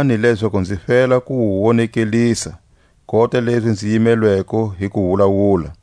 kombelani lezaku nzi fela ku wu wonekelisa, kota lezi nzi yimelweko hi ku wulawula.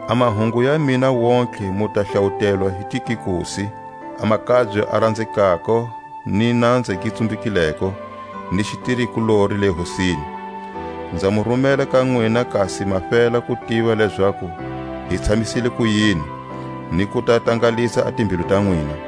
A mahungu ya mina wontihe mu ta hlawutelwa hi Tikikusi, a makabye a ranzekako ni nanza gi tsumbekileko, ni xitiri-kulori le Hosini. Nza mu rumela ka nwina kasi ma fela ku tiva lezaku hi tshamisa kuyini, ni ku ta tangalisa a timbilu ta nwina.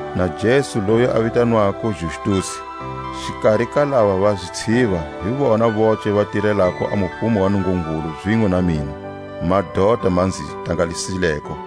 na Jesu loyi a vitanwako Justusi. Xikari ka lava va zitshiva hi vona voce va tirelako a mufumo wa Nungungulu zinwe na mina; madota ma nzi tangalisileko.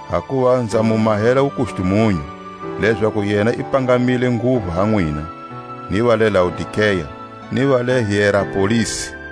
Hakuva nza mu mahela wukustumunyu, lezaku yena i pangamile nguvu ha nwina, ni va le Laodikea, ni va le Hierapolisi.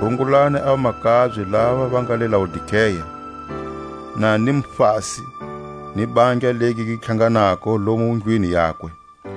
Rungulani a vamakabye lava va nga le Laodikea, na Nimfasi, ni bandla legi gi tlhanganako lomu ndlwini yakwe.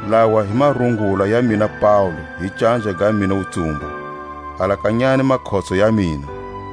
Lawa hi marungula ya mina Paule hi canja ga mina wutsumbu. Alakanyani makhotso ya mina.